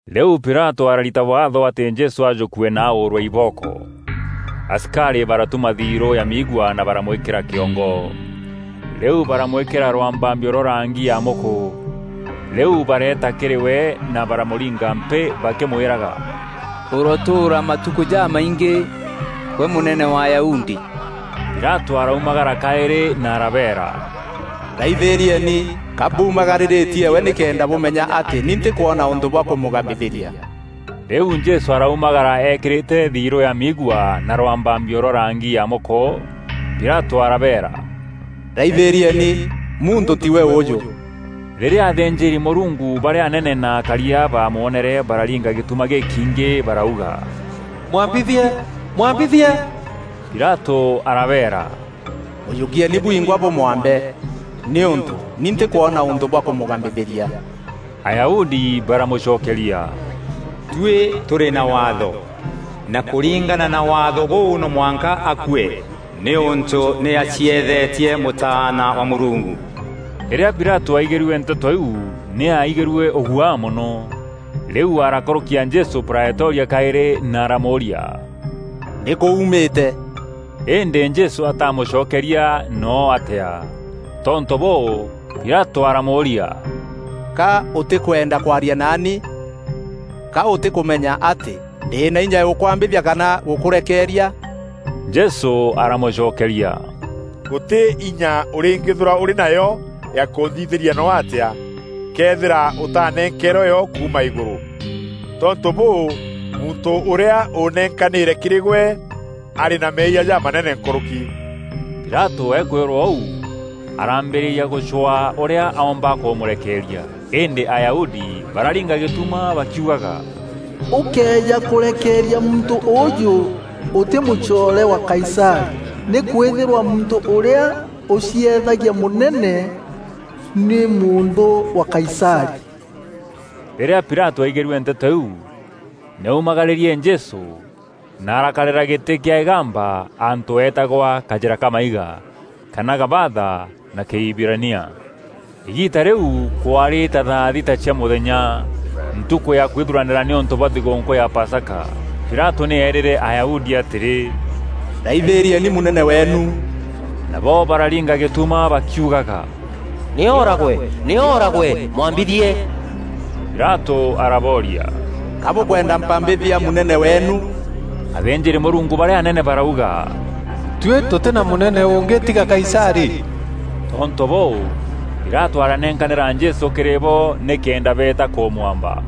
Rîu Pilatû ararita Waatho atî Jesû ajûkue na aûûrwe ibooko. Asikarî baratuma thirû ya miigua na baramwîkîra kîongo. Rîu baramwîkîra rwambambio rwa rangî ya mûkû. Rîu bareeta kîrî we na baramûringa mpîî bakîmwîraga, “Ûrotûûra matukû jamaingî, gwe Mûnene wa Ayahudi!” Pilatû araumagara kaîrî na arabeera, “Raithîrieni, ka mbuumagarîrîtie we nîkenda bûmenya atî ni ntîkwona ûntû bwa kûmûgambithîria.” Rîu Jesû araumagara eekîrîte thirû ya miigua na rwambambio rwa rangî ya mûkû. Pilatû arabeera, “Raithîrieni! Muntû tîwe ûûjû.” Rîrîa athînjîri-Mûrungu barîa anene na akaria baamwonere bararinga gîtuma gîkiingî barauga, “Mwambithie, Mwambithie!” Pilatû arabeera, “Mûjûkieeni bwingwa bûmwambe, nîûntû ni ntîkwona ûntû bwa kûmûgambithîria.” Ayahudi baramûcokeria, “Tuî tûrî na Waatho, na kûringana na Waatho bûu no mwanka akue, nîûntû nî acieethetie Mûtaana wa Mûrungu.” Rîrîa Pilatû aaigîrue nteto iu nî aaigîrue ûguaa mono. Rîu arakûrûkia Jesû Praetoria kaîrî na aramûûria, “Nîkû uumîte?” Îndî Jesû ataamûcokeria noo atîa. Tontû bûû, Pilatû araamûûria, “Ka ûtîkwenda kwaria naani? Ka ûtîkûmenya atî ndî na inya ya gûkwambithia kana gûkûrekeeria?” Jesû aramûcokeria, “Gûtî inya ûrîngîîthîrwa ûrî nayo ya kûnthithîria noo atîa, këethîra ûtaanenkeerwe yo kuuma îgûrû. Tontû bûû, muntû ûrîa ûnenkanîre kîrî gwe, arî na meeyia jamanene nkûrûki.” Pilatû akwîrwa ûu araambîrîria gûcwaa ûrîa oomba kûmûrekeeria, îndî Ayahudi bararinga gîtuma bakiugaga, “Ûkëeja kûrekeeria muntû ûûjû, ûtî mûcoore wa Kaisarî, nîkwîthîrwa muntû ûrîa ûcieethagia mûnene, nî mûnthû wa Kaisarî!” Rîrîa Pilatû aaigîrue nteto iu, nî aaumagarîrie Jesû na arakarîra gîtî kîa îgamba antû eetagwa “Kajîra ka maiga,” kana “Gabatha” na Kîhibirania. Îgiita rîu kwaarî ta thaa thita cia mûthenya, ntukû ya kwithuranîra nîûntû bwa thigûûnkû ya Pasaka. Pilatû nî eerîre Ayahudi atîrî, “Raithîrieni Mûnene weenu!” Nabo bararinga gîtuma bakiugaga, “Nî ooragwe, nî ooragwe! Mwambithie!” Pilatû arabooria, “Ka bûkwenda mpambithia Mûnene weenu?” Athînjîri-Mûrungu barîa anene barauga, “Tuî tûtî na mûnene ûngî tiga Kaisarî.” Tontû bûû, Pilatû aranenkanîra Jesû kîrî bo nîkenda beeta kûmwamba.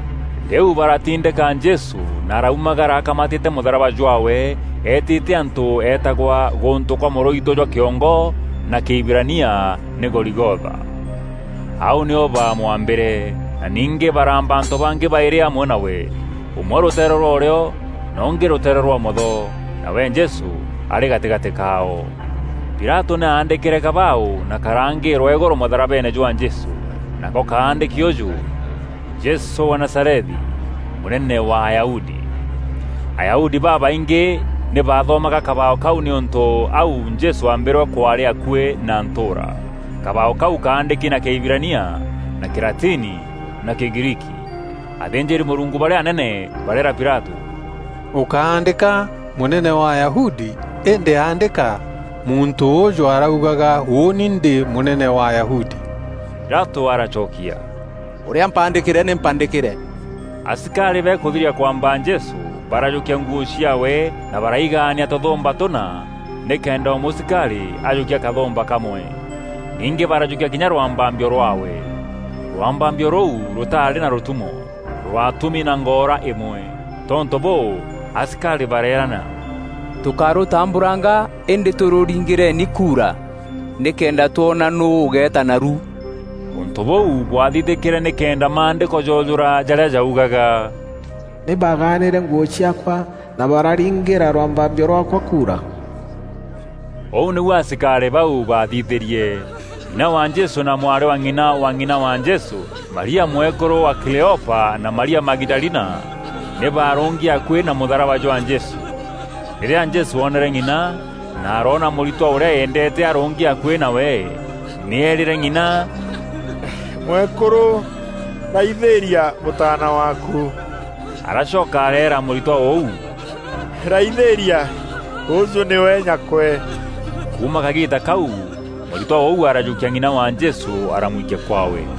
Rîu baratindîka Jesû na araumagara akamatîte mûtharaba jwaawe eetîte antû eetagwa “Gûntû kwa mûrûitû jwa kîongo,” na Kîhibirania nî “Goligotha.” Au nîo bamwambîre, na ningî baraamba antû bangî baîrî amwe nawe; ûmwe rûteere rwa ûrîo na ûngî rûteere rwa ûmotho, nawe Jesû arî gatîgatî kaao. Pilatû nî aandîkîre kabaaû na karaangîrwa îgûrû mûtharabeene jwa Jesû, nako kaandîki ûûjû, “Jesû wa Nazarethi, Mûnene wa Ayahudi.” Ayahudi babaingî nî bathomaga kabaaû kaû nîûntû au Jesû aambîrwe kwaarî akuî na ntûûra. Kabaaû kaû kaandîki na Kîhibirania na Kîlatini na Kîgriiki. Athînjîri-Mûrungu barîa anene bareera Pilatû, “Ûkándîka, ‘Mûnene wa Ayahudi,’ îndî aandîka, ‘Muntû ûûjû aaraugaga, ûûni ndî mûnene wa Ayahudi.’” Pilatû aracokia, “Ûrîa mpaandîkîre, nî mpaandîkîre.” Asikarî bakûthiria kwamba Jesû barajûkia nguû ciaawe na baraigaania tûthûûmba tûna nîkenda o mûsikarî ajûkia kathûmba kamwe. Ningî barajûkia kinya rwambambio rwaawe. Rwambambio rûu rûtaarî na rûtumo, rwatûmi na ngoora îmwe. Tontû bûû, asikarî bareerana, “Tûkárûtambûranga îndî tûrûringîreni kuura nîkenda twona nûû ûgeeta naru.” Ûntû bûu bwathithîkîre nîkenda Maandîko joojûra jarîa jaugaga, “Nî baaganîre nguû ciaakwa, na bararingîra rwambambio rwaakwa kuura.” Ûu nîu asikarî bau baathithîrie. Ng'ina wa Jesû na mwarî wa ng'ina wa ng'ina wa Jesû, Maria mwekûrû wa Kileopa na Maria Magidalina nî baarûngi akuî na mûtharaba jwa Jesû. Rîrîa Jesû oonere ng'ina, na aroona mûritwa ûrîa eendeete arûngi akuî nawe, nî eerîre ng'ina, “Mwekûrû, raithîîria mûtaana waaku!” Aracoka areera mûritwa ûu, “Raithîîria, ûûjû nîwe nyakwe.” Kuuma kagiita kau mûritwa ûu arajûkia ng'ina wa Jesû aramwikia kwaawe.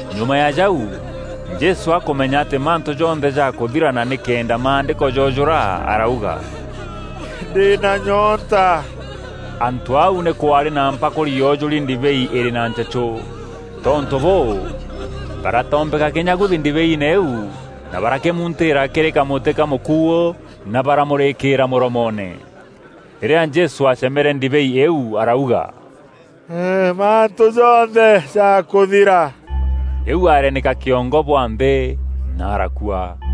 Nyuma ya jau, Jesû akûmenya atî mantû jonthe jaakûthira na nîkenda Maandîko joojûra arauga, “Ndî na nyoonta.” Antû au nî kwaarî na mpakûri yoojûri ndibei îrî na nchechû. Tontû bûû, baratombeka kînyaguthi ndibeiine îîu na barakîmuntîîra kîrî kamûti ka mûkuû na baramûrîkîîra mûromoone. Rîrîa Jesû aacemere ndibei îîu arauga, “Mantû jonthe jakûthira.” Rîu areenîka kîongo bwa nthî na arakua.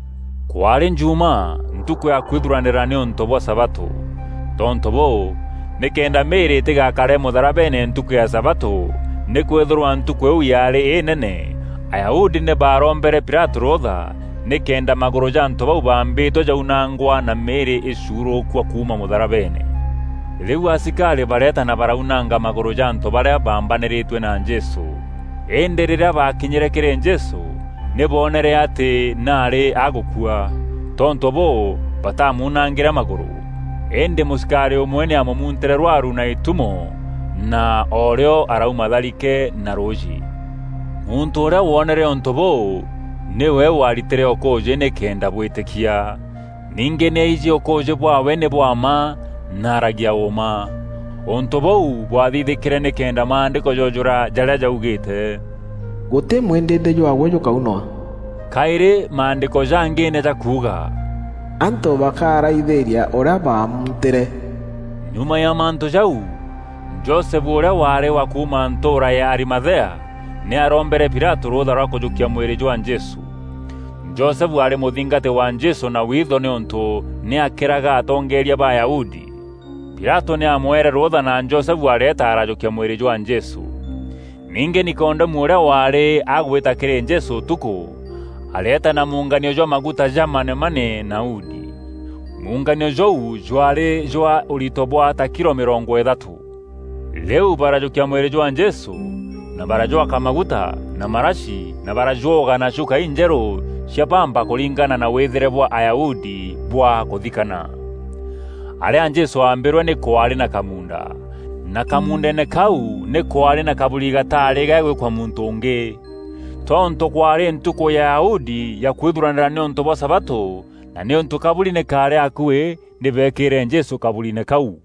Kwaarî Jumaa, ntukû ya kwithuranîra nîûntû bwa sabatû. Tontû bûû, nîkenda mîîrî îtîgakare mûtharabeene ntukû ya sabatû nîkwîthîrwa ntukû îîu yaarî înene, Ayahudi nî baarombere Pilatû rûûtha nîkenda magûrû ja antû bau baambîtwe jaunangwa na mîîrî îcuurûkua kuuma mûtharabeene. Rîu asikarî bareeta na baraunanga magûrû ja antû barîa baambanîrîtue na Jesû. Îndî rîrîa baakinyîre kîrî Jesû nî boonere atî nî aarî agûkua. Tontû bûû batamuunangîre magûrû. Îndî mûsikarî ûmwe nî aamûmuntîre rwaru na îtumo na oorîo araûma tharike na rûûjî. Muntû ûrîa woonere ûntû bûu nîwe waaritîre ûkûûjî nîkenda bwîtîkia. Ningî nî aijî ûkûûjî bwaawe nî bwa mma na aaragia ûûma. Ûntû bûu bwathithîkîre nîkenda Maandîko joojûra jarîa jaugîîte, “Gûtî mwîndîndî jwaawe jûkaunwa.” Kaîrî Maandîko jangî nî jakuuga, “Antû bakaaraithîîria ûrîa baamuntîre.” Nyuma ya mantû jau, Josefu ûrîa waarî wa kuuma ntûûra ya Arimathea, nî aarombere Pilatû rûûtha rwa kûjûkia mwîrî jwa Jesû. Josefu aarî mûthingati wa Jesû na witho nîûntû nî aakîraga atongeeria ba Ayahudi. Pilatû nî aamwere rûûtha na Josefu areeta arajûkia mwîrî jwa Jesû. Ningî Nikodemu ûrîa waarî agwîta kîrî Jesû ûtukû, areeta na munganio jwa maguta ja manemane na udi. Munganio jûu jwaarî jwa ûrito bwa ta kilo mîrongo îthatû. Rîu barajûkia mwîrî jwa Jesû na barajwaka maguta na marashi na barajwoga na chuka injerû cia bamba kûringana na wîthîre bwa Ayahudi bwa kûthikana. Arîa Jesû aambîrwe nî kwaarî na kamuunda, na kamuundeene kau nî kwaarî na kaburi gataarî gagwîkwa muntû ûngî. Tontû kwaarî ntukû ya Ayahudi ya kwithuranîra nîûntû bwa sabatû, na nîûntû kaburi nî kaarî akuî nî beekîre Jesû kaburiine kau.